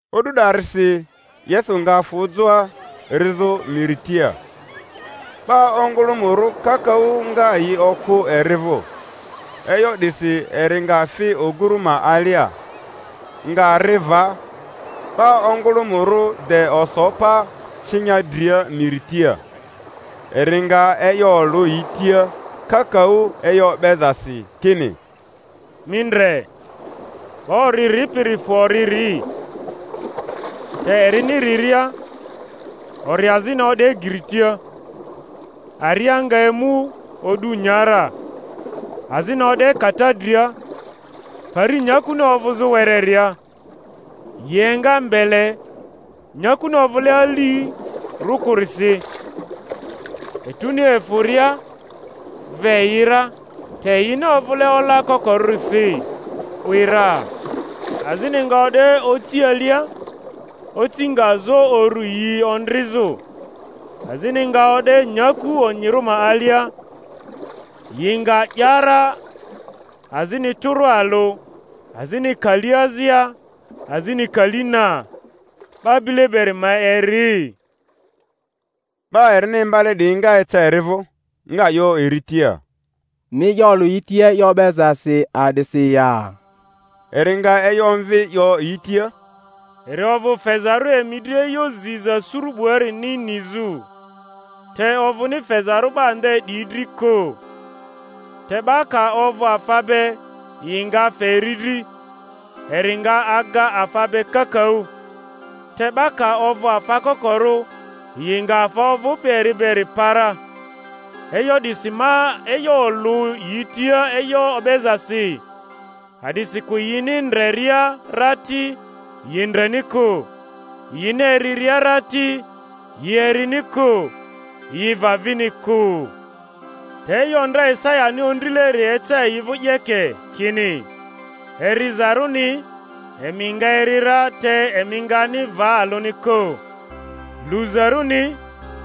O'du 'darisi Yesu nga fᴜ joa, rizᴜ miri tia. 'Ba ongᴜlᴜmᴜrᴜ kakaᴜ nga yi okᴜ eri vᴜ, e'yo 'disi eri nga fi oguru ma alia, nga ri va; 'ba ongᴜlᴜmᴜrᴜ de oso pa cinya dria miri tia. Eri nga e'yo olᴜ yi tia kakaᴜ e'yo o'bezasi, kini: Mi ndre, 'ba ori ripiri fᴜ ori ri. Te erini riria, ori azini o'de geri tia, aria nga emu o'du, nya ra. Azini o'de kata dria, pari nyakuni ovᴜzᴜ wereria, yi enga mbele, nyakuni ovᴜle alirᴜ kᴜrisi, etuni efᴜria, ve yi ra; te yini ovᴜle ola kokorᴜrisi, 'wi ra. Azini nga o'de oci alia, oci nga zo uru yi ondrizᴜ. Azini nga o'de nyaku onyirᴜ ma alia, yi nga 'ya ra, azini tᴜrᴜ alᴜ, azini kali azia, azini kali na. 'Ba bile beri ma eri. 'Ba erini imbale 'diyi nga eca eri vᴜ, nga 'yo eri tia, Mi e'yo olᴜ yi tia e'yo o'bezasi a'disi ya? Eri nga e'yo omvi, 'yo yi tia, Eri ovᴜ fezarᴜ emi dri e'yo ziza suru 'buarini nizᴜ, te ovᴜni fezarᴜ 'ba nde 'diyi dri kᴜ. Te 'ba ka ovᴜ afa be, yi nga fe eri dri, eri nga aga afa be kakaᴜ; te 'ba ka ovᴜ afa kokorᴜ, yi nga afa ovᴜpi eri beri pa ra. E'yo 'disi ma e'yo olᴜ yi tia e'yo o'bezasi, a'disikᴜ yini ndreria ra ti, yi ndreni kᴜ, yini eriria ra ti, yi erini kᴜ, yi va vini kᴜ. Te e'yo ndra Isayani ondrileri eca yi vᴜ 'yeke, kini: Erizarᴜni, emi nga eri ra, te emi ngani va alᴜni kᴜ; luzarᴜni,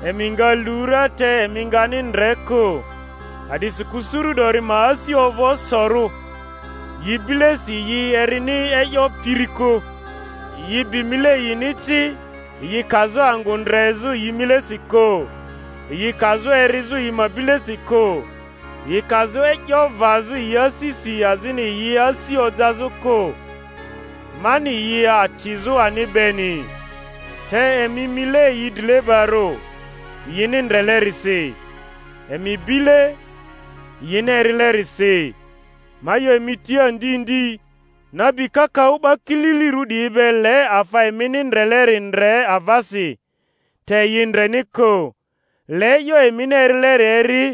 emi nga lu ra, te emi ngani ndre kᴜ. A'disikᴜ suru 'dori ma asi ovᴜ osorᴜ, yi bilesi yi erini e'yo piri kᴜ, yi bi mile yini ci, yi kazᴜ angᴜ ndrezᴜ yi milesi kᴜ, yi kazᴜ erizᴜ yi ma bilesi kᴜ, yi kazᴜ e'yo vazᴜ yi asisi azini yi asi ojazᴜ kᴜ, mani yi atizᴜ ani beni. Te emi mile yi drilebarᴜ, yini ndrelerisi; emi bile, yini erilerisi. Ma 'yo emi tia ndi ndi, nabi kakaᴜ 'ba kililirᴜ 'diyi be le afa emini ndreleri ndre avasi, te yi ndreni kᴜ; le e'yo emini erileri eri,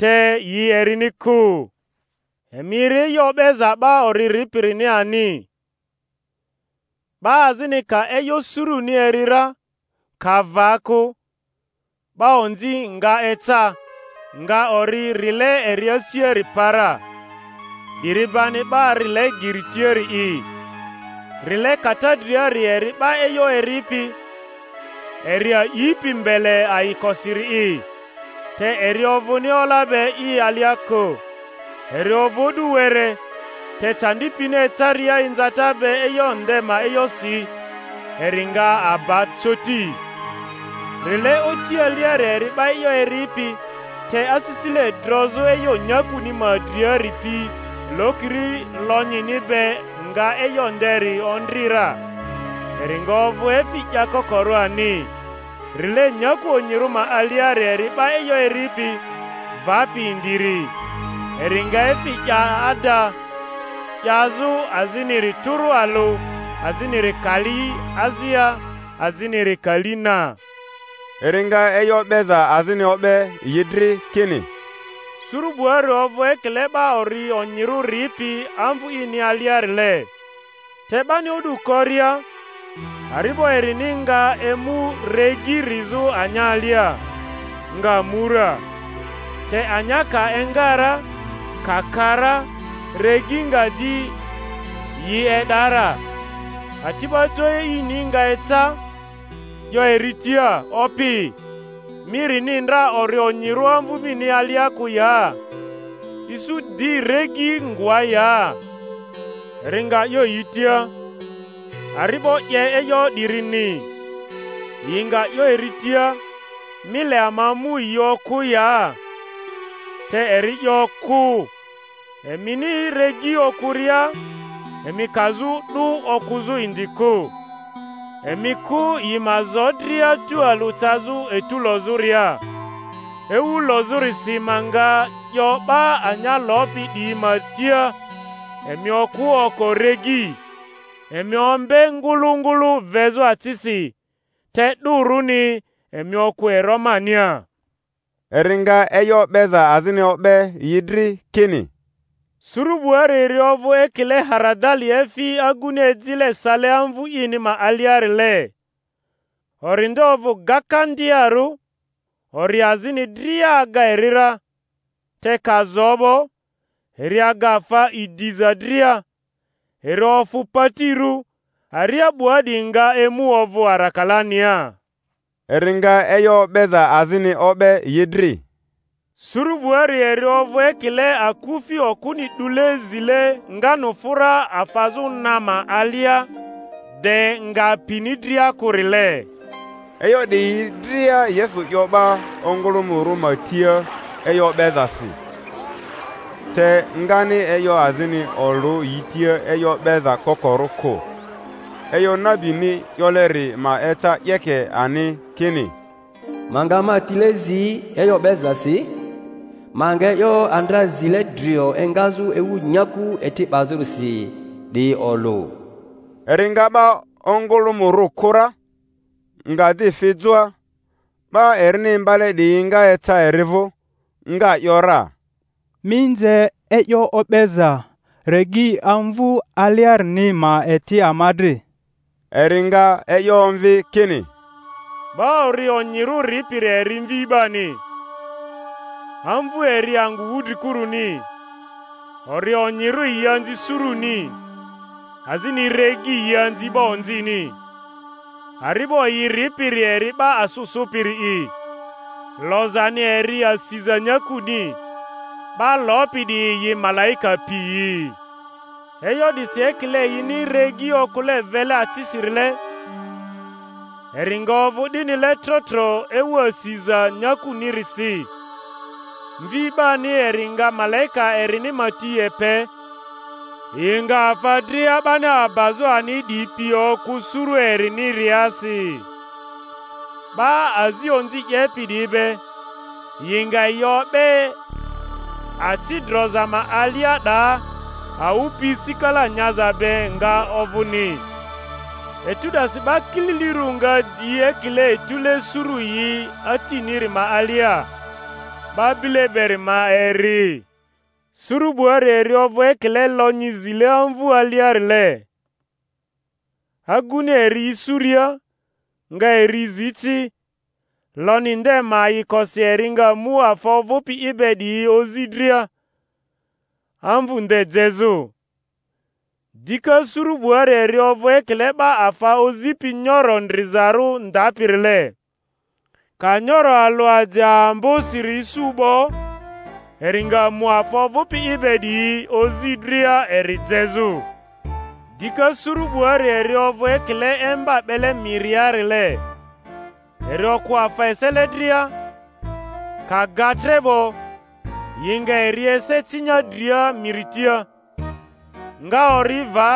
te yi erini kᴜ. Emi eri e'yo o'beza 'ba ori ripirini ani. 'Ba azini ka e'yo suruni eri ra, ka va kᴜ, 'ba onzi nga eca, nga ori rile eri asiari pa ra; 'diri bani 'ba rile geri tiari'i. Rile kata driari eri 'ba e'yo eripi, eri a'ipi mbele ayikosiri'i; te eri ovᴜni ola be i alia kᴜ, eri ovᴜ o'du were, te candi pini ecaria inzata be e'yo nde ma e'yosi, eri nga aba coti. Rile oci aliari eri 'ba e'yo eripiri, te asisile drozᴜ e'yo nyakuni ma driari pi lokiri lonyini be nga e'yo nderi ondri ra, eri nga ovᴜ efi 'yakokorᴜ ani. Rile nyaku onyirᴜ ma aliari eri 'ba e'yo eripi, vapi indiri; eri nga efi 'ya ada, 'yazᴜ aziniri tᴜrᴜ alᴜ, aziniri kali azia, aziniri kali na. Eri nga e'yo o'beza azini o'be yi dri, kini, Suru 'buari ovᴜ ekile 'ba ori onyirᴜ ripi amvu ini aliarile; te 'bani o'du koria, ari'bo erini nga emu regi rizᴜ anya alia, nga mu ra. Te anya ka enga ra, ka ka ra, regi nga di yi e'da ra. Ati'ba jo e'ini nga eca, 'yo eri tia, Opi, mi rini ndra ori onyirᴜ amvu mini alia kᴜ ya? Isu di regi ngoa ya? Eri nga 'yo yi tia, Ari'bo 'ye e'yo 'dirini. Yi nga 'yo eri tia, Mi le ama mu yi okᴜ ya? Te eri 'yo, Kᴜ; emini regi okᴜria emi kazᴜ 'dᴜ okᴜzᴜ indi kᴜ. Emi kᴜ yi ma zo dria tualᴜ cazᴜ etu lozᴜria; ewu lozᴜrisi ma nga 'yo 'ba anya lopi 'diyi ma tia, Emi okᴜ oko regi, emi ombe ngᴜlᴜ ngᴜlᴜ vezᴜ acisi, te 'dᴜrᴜni emi okᴜ ero mania. Eri nga e'yo o'beza azini o'be yi dri, kini, Suru 'buari eri ovᴜ ekile haradali efi aguni ejile sale amvu ini ma aliarile; ori nde ovᴜ gakandiarᴜ, ori azini dria aga eri ra, te ka zo 'bo, eri aga afa idiza dria, eri ofᴜ patirᴜ, aria 'bua 'diyi nga emu ovᴜ arakalania. Eri nga e'yo o'beza azini o'be yi dri: Suru 'buari eri ovᴜ ekile akufi okᴜni 'dule zile nganufᴜra afazᴜ na ma alia, de nga pini dria kᴜrile. E'yo 'diyi dria Yesu 'yo 'ba ongᴜlᴜmᴜrᴜ ma tia e'yo o'bezasi; te ngani e'yo azini olᴜ yi tia e'yo o'beza kokorᴜ kᴜ. E'yo nabini 'yoleri ma eca 'yeke ani, kini: Ma nga ma tile zi e'yo o'bezasi, ma nga e'yo andra zile drio engazᴜ ewu nyaku eti 'bazᴜrisi 'diyi olᴜ. Eri nga 'ba ongᴜlᴜmᴜrᴜ kᴜ ra, nga di fi joa. 'Ba erini imbale 'diyi nga eca eri vᴜ, nga ‘yora, Mi nze e'yo o'beza regi amvu aliarini ma eti ama dri. Eri nga e'yo omvi kini, 'Ba ori onyirᴜ ripiri eri Mvi 'bani; amvu eri angᴜ wudrikuruni, ori onyirᴜ yi anzi suruni; azini regi yi anzi 'ba onzini; ari'bo yi ripiri eri 'ba asᴜ sᴜpiri'i; lozani eri asiza nyakuni; 'ba lopi 'diyi yi malaika piyi. E'yo 'disi ekile yini regi okᴜle vele acisirile, eri nga ovᴜ 'dinile tro tro ewu asiza nyakunirisi. Mvi 'bani eri nga malaika erini ma ti epe, yi nga afa dria 'bani abazᴜ ani 'diyi pi okᴜ suru eriniriasi, 'ba azi onzi 'yepi 'diyi be, yi nga yi o'be aci droza ma alia; 'daa awᴜ pi sikala nyaza be nga ovᴜni. Etu 'dasi 'ba kililirᴜ nga di ekile etᴜle suru yi Atiniri ma alia. 'Ba bile beri ma eri. Suru 'buari eri ovᴜ ekile lonyi zile amvu aliarile; aguni eri isuria, nga eri zi ci; lonyi nde ma ayikosi eri nga mu afa ovᴜpi i be 'diyi ozi dria, amvᴜ nde jezᴜ. Dika suru 'buari eri ovᴜ ekile 'ba afa ozipi nyoro ndrizarᴜ ndapirile; ka nyoro alᴜ aje ambosiri isu 'bo, eri nga mu afa ovᴜpi i be 'diyi ozi dria eri jezᴜ. Dika suru 'buari eri ovᴜ ekile emba 'bele miriarile, eri okᴜ afa esele dria; ka ga tre 'bo, yi nga eri ese cinya dria miri tia, nga ori va,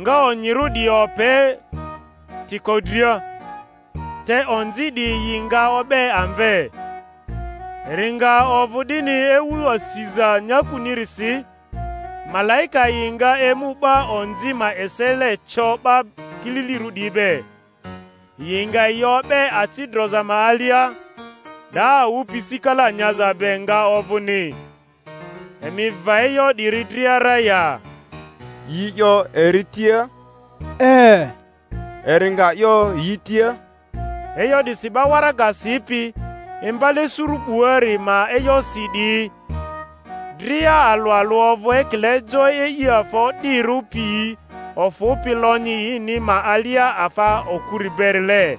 nga onyirᴜ 'diyi ope tiko dria, te onzi 'diyi yi nga o'be amve. Eri nga ovᴜ 'dini ewu asiza nyakunirisi. Malaika yi nga emu 'ba onzi ma esele co 'ba kililirᴜ 'diyi be, yi nga yi o'be aci droza ma alia; 'daa awᴜ pi sikala nyaza be nga ovᴜni. Emi va e'yo 'diyi dria ra ya? Yi 'yo eri tia, E. Eri nga 'yo yi tia, E'yo 'disi 'ba waraga sipi, imbale suru 'buari ma e'yosi 'diyi dria alᴜ alᴜ ovᴜ ekile jo e'i afa o'dirᴜ piyi ofᴜpi lonyi ini ma alia afa okuri berile.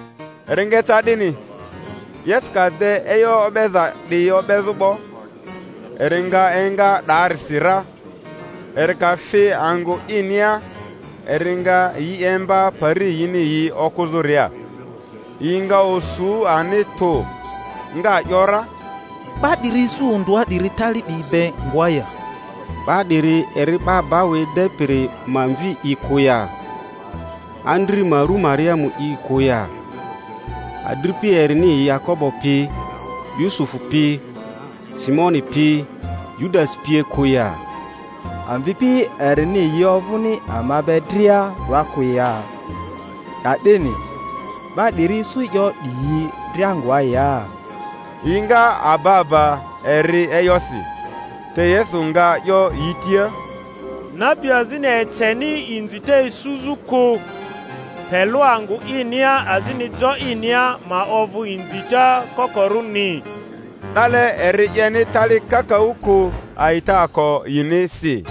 Eri nga eca 'dini, Yesu ka de e'yo o'beza 'diyi o'bezᴜ 'bo, eri nga enga 'daarisi ra. Eri ka fi angᴜ inia eri nga yi imba pari yini yi okᴜzᴜria; yi nga osu ani tᴜ, nga ‘yora, 'Ba 'diri isu ondᴜa 'diri tali 'diyi be ngoa ya? 'Ba 'diri eri 'ba bau edepiri ma mvi'i kᴜ ya? Andri ma rᴜ Mariamu'i kᴜ ya? Adripi erini yi Yakobo pi, Yusufu pi, Simoni pi, Yudasi pie kᴜ ya? Amvipi erini yi ovᴜni ama be dria 'doa kᴜ ya? Ka'dini 'ba 'diri isu e'yo 'diyi dria ngoa ya? Yi nga aba aba eri e'yosi. Te Yesu nga 'yo yi tia, Nabi azini eceni inzita isuzᴜ kᴜ, pe lᴜ angᴜ inia azini jo inia ma ovᴜ inzita kokorᴜni. 'Dale eri 'yeni tali kakaᴜ kᴜ, a'itaako yinisi.